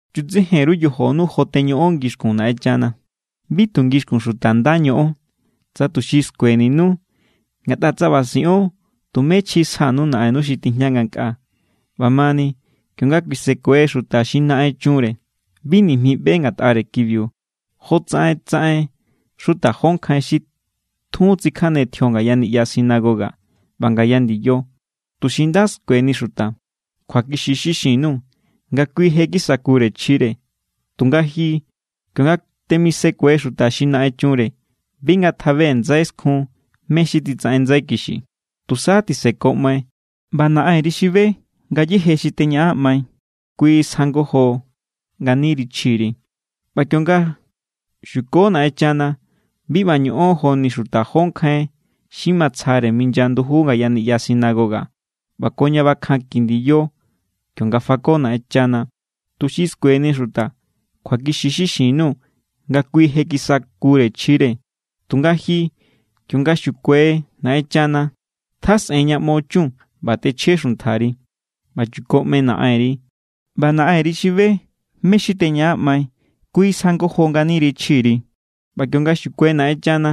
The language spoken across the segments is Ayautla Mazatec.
’Chutsejen_ru yojonu jo teñoꞌon ngixkun Naꞌenchana. Bi tu ngixkun xuta nda ñoꞌon, tsa tuxi skueninu. Ngatꞌa tsa ꞌba siꞌon, tume chji sjanu Naꞌennu xi tijña ngankꞌaa. ꞌBa mani, kionga kuisekue xuta xi naꞌen chunre, bi nijmi ꞌbe ngatꞌare kibiu jotsaꞌen tsaꞌen xuta jó nkjain xi tjun tsikjane tjio ngaya niꞌya sinagoga ꞌba ngaya ndiyo, tuxi nda skueni xuta. Kjuakixi= xi xin_nuu̱ nga kui je kisakure chjire. Tunga ji, kionga temisekue xuta xi naꞌen chunre, bi ngatjabe ndsai skjun mé= xi titsaꞌen ndsai kixi. Tusa tisekoꞌmai. ꞌBa Naꞌenri xi be ngayéje xi teñaꞌanꞌmai, kui sjangojo nganiri chjiri. ’ꞌBa kionga xuko Naꞌenchana, bi ꞌba ñoꞌon joni xuta jó nkjain xi matsjare minya nduju ngaya niꞌya sinagoga ꞌba ko ña bakjanki ndiyo kionga fako Naꞌenchana, tuxi skueni xuta. Kjuakixi= xi xin_nuu̱ nga kui je kisakure chjire. Tunga ji, kionga xukuai Naꞌenchana, tjasꞌen ña ꞌmo chun ꞌba tꞌechje xuntjari, ꞌba chukoꞌmai Naꞌenri. ꞌBa Naꞌenri xi be mé= xi teñaꞌanꞌmai, kui sjangojo nganiri chjiri. ’ꞌBa kionga xukuai Naꞌenchana,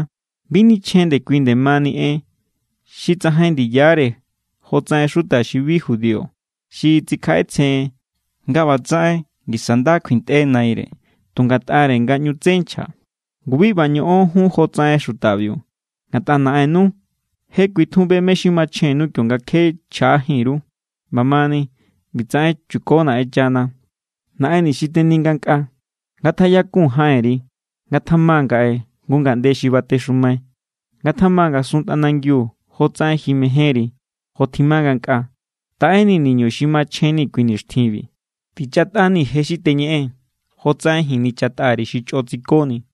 bi nichjen ndekui nde mani en xi tsajain ndiyare jotsaꞌen xuta xi bi judío xi tsikjaꞌetsjen nga ꞌbatsaꞌen ngisa nda kjuintꞌe naire tu ngatꞌare nga ꞌñu tsé nchja. Ngu bi ꞌba ñoꞌon jun jotsaꞌen xutabiu. Ngatꞌa Naꞌennu je kui tjun be mé= xi machjennu kionga kje chjaꞌajín_ru. ꞌBa mani, ꞌbitsaꞌen chuko Naꞌenchana: Naꞌenni xi teni ngankꞌaa, ngatjaꞌyakun jaꞌenri. Ngatjama ngaꞌe jngu ngaꞌnde xi batexumai. Ngatjama ngasun tꞌanangiu jotsaꞌen ji mejénri, jo tjima ngankꞌaa. Taꞌenii̱ niñu xi machjenni̱ kui nixtjinbi. Tichatꞌanii̱ je xi teñeꞌee̱n, jotsaꞌen ji̱n nichatꞌa_ri̱ xi chꞌo tsikoni̱.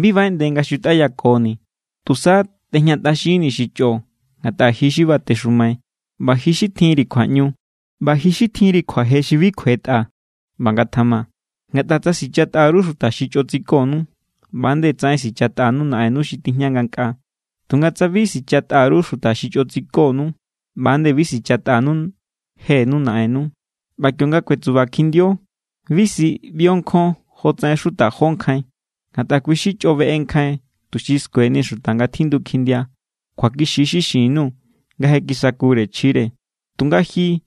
Bi baꞌeꞌnde nga xutꞌayakoni̱. Tusa tꞌejñatꞌaxinnii̱ xi chꞌo. Ngatꞌa ji xi batexumai, ꞌba ji xi tjinri kjuaꞌñu, ꞌba ji xi tjinri kjuaje xi bi kjuetꞌa. ꞌBa ngatjama. ’Ngatꞌa tsa sichatꞌa_ru xuta xi chꞌo tsikonu, ꞌba=nde tsaꞌen sichatꞌanu Naꞌennu xi tijña ngankꞌaa. Tunga tsa bi sichatꞌa_ru xuta xi chꞌo tsikonu, ꞌba=nde bi sichatꞌanu jenu Naꞌennu. ’ꞌBa kionga kuetsuba kjindio, bi si ꞌbio nkjon jotsaꞌen xuta jó nkjain. Ngatꞌa kui= xi chꞌo beꞌe nkjain, tuxi skueni xuta nga tjindu kjindia. Kjuakixi= xi xin_nuu̱ nga je kisakure chjire. Tunga ji,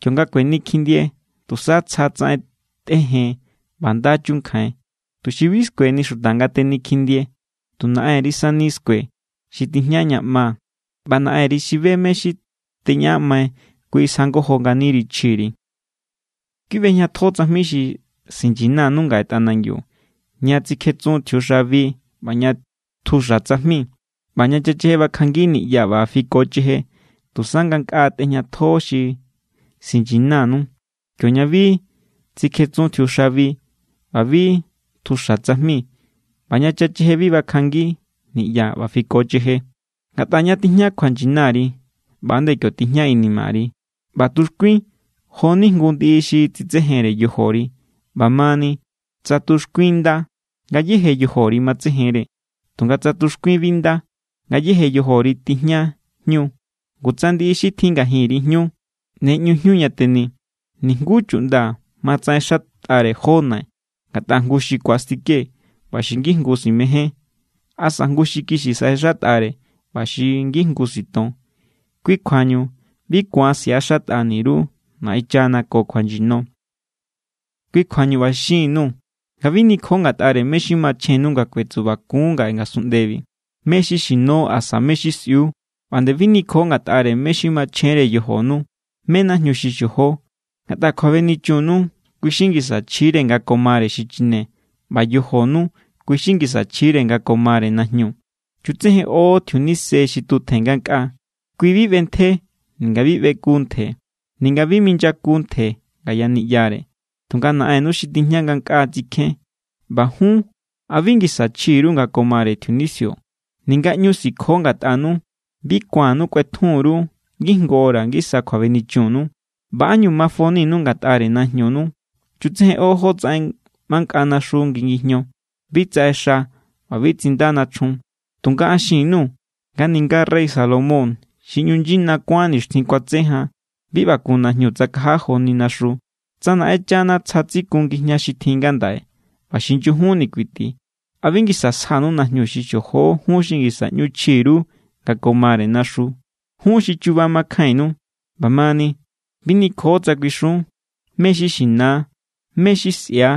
kionga kueni kjindie, tusa tsja tsaꞌen tꞌejen ꞌba nda chunkjain, tuxi bi skueni xuta nga teni kjindie. Tu Naꞌenri sani skue, xi tijña ña ꞌma. ꞌBa Naꞌenri xi be mé= xi teñaꞌanꞌmai, kui sjangojo nganiri chjiri. ’Bi ꞌbejñatjo tsajmi xi sinyinanu ngaꞌe tꞌanangiu, ña tsikjetsun tjiuxabi ꞌba ña tjuxa tsajmi ꞌba ña chacheje bakjanngi niꞌya ꞌba fikocheje. Tusa ngankꞌaa tꞌejñatjo xi sinyinanu, kioña bi tsikjetsun tjiuxabi ꞌba bi tjuxa tsajmi ꞌba ña chacheje bi bakjanngi niꞌya ꞌba fikocheje. Ngatꞌa ña tijña kjuanyinari, ꞌba=nde kio tijña inimari. ’ꞌBa tuxkuin jo=ni jngu ndiꞌi xi tsitsejenre yojori. ꞌBa mani, tsa tuxkuin nda, ngayéje yojori matsejenre. Tunga tsa tuxkuin bi nda, ngayéje yojori tijña jñu. Ngu tsa ndiꞌi xi tjin ngajinri jñu, ¡ne ꞌñu jñu ña teni! ’Nijnguú chuꞌnda ma tsaꞌexatꞌare jó nai. Ngatꞌa jngu xi ku̱astike ꞌba xi ngijngu simején, asa jngu xi kixi saꞌexatꞌare ꞌba xi ngijngu siton. Kui kjuañu bi ku̱an siꞌaxatꞌani_ru Naꞌenchana ko kjuanyino. ’Kui kjuañu ꞌba xin_nuu̱ nga bi nikjo ngatꞌare mé= xi machjennu nga kuetsubakun ngaꞌe ngasunꞌndebi, mé= xi xino asa mé= xi sꞌiu. ꞌBa nde bi nikjo ngatꞌare mé= xi machjenre yojonu, mé= najñu xi xojo. Ngatꞌa kjuabenichunnu, kui= xi ngisa chjire nga ko mare xichine. ꞌBa yojonu, kui= xi ngisa chjire nga ko mare najñu. Chutsejenꞌo tjiunise xi tutjen ngankꞌaa. Kui bi ꞌbentje, ninga bi ꞌbeku ntje, ninga bi minyaku ntje ngaya niꞌyare. Tunga Naꞌennu xi tijña ngankꞌaa tsikjén. ꞌBa jun, ¿a bi ngisa chji_ru nga ko mare tjiunisio? Ninga ꞌñu sikjo ngatꞌanu, bi ku̱annu kꞌuetjun_ru ngijngu hora ngisa kjuabenichunnu. ’ꞌBa ¿ánñu mafoninu ngatꞌare najñunu? Chutsejenꞌo jótsaꞌen mankꞌa naxu ngi ngijño. Bi tsaꞌexa ꞌba bi tsinda nachjun. Tunga an xin_nuu̱ nga ninga rey Salomón xi ꞌñu nyina kuán nixtjin kuatse jan, bi ꞌba kun najñu tsakaja joni naxu. Tsa Naꞌenchana tsja tsikun ngijña xi tjin ngandaꞌe ꞌba xi nyujunni kuiti, ¿a bi ngisa sjanu najñu xi xojo jun xi ngisa ꞌñu chji_ru nga ko mare naxu? ¡Jun xi chuba makjainnu! ꞌBa mani, bi nikjo tsa kuixun: “¿Mé= xi xina?”, “¿mé= xi sꞌia?”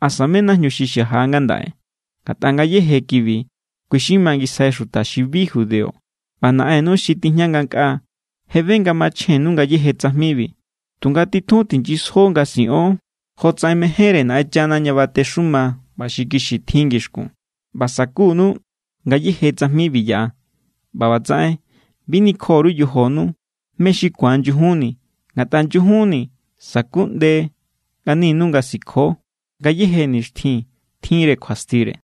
asa “¿mé= najñu xi xaja ngandaꞌe?” Ngatꞌa ngayéje kibi, kui= xi mangisjai xuta xi bi judío, ꞌba Naꞌennu xi tijña ngankꞌaa je be nga machjennu ngayéje tsajmibi. Tunga titjun tinyisjo nga siꞌon jotsaꞌen mejénre Naꞌenchana ña batexuma ꞌba xi kixi tjin ngixkun, ꞌba sakunu ngayéje tsajmibi yaꞌa. ꞌBa ꞌbatsaꞌen, bi nikjo_ru yojonu mé= xi ku̱an nyujunni, ngatꞌa nyujunni sakuꞌnde nganinu nga sikjo. Ngayéje nixtjin tjinre kjuastire.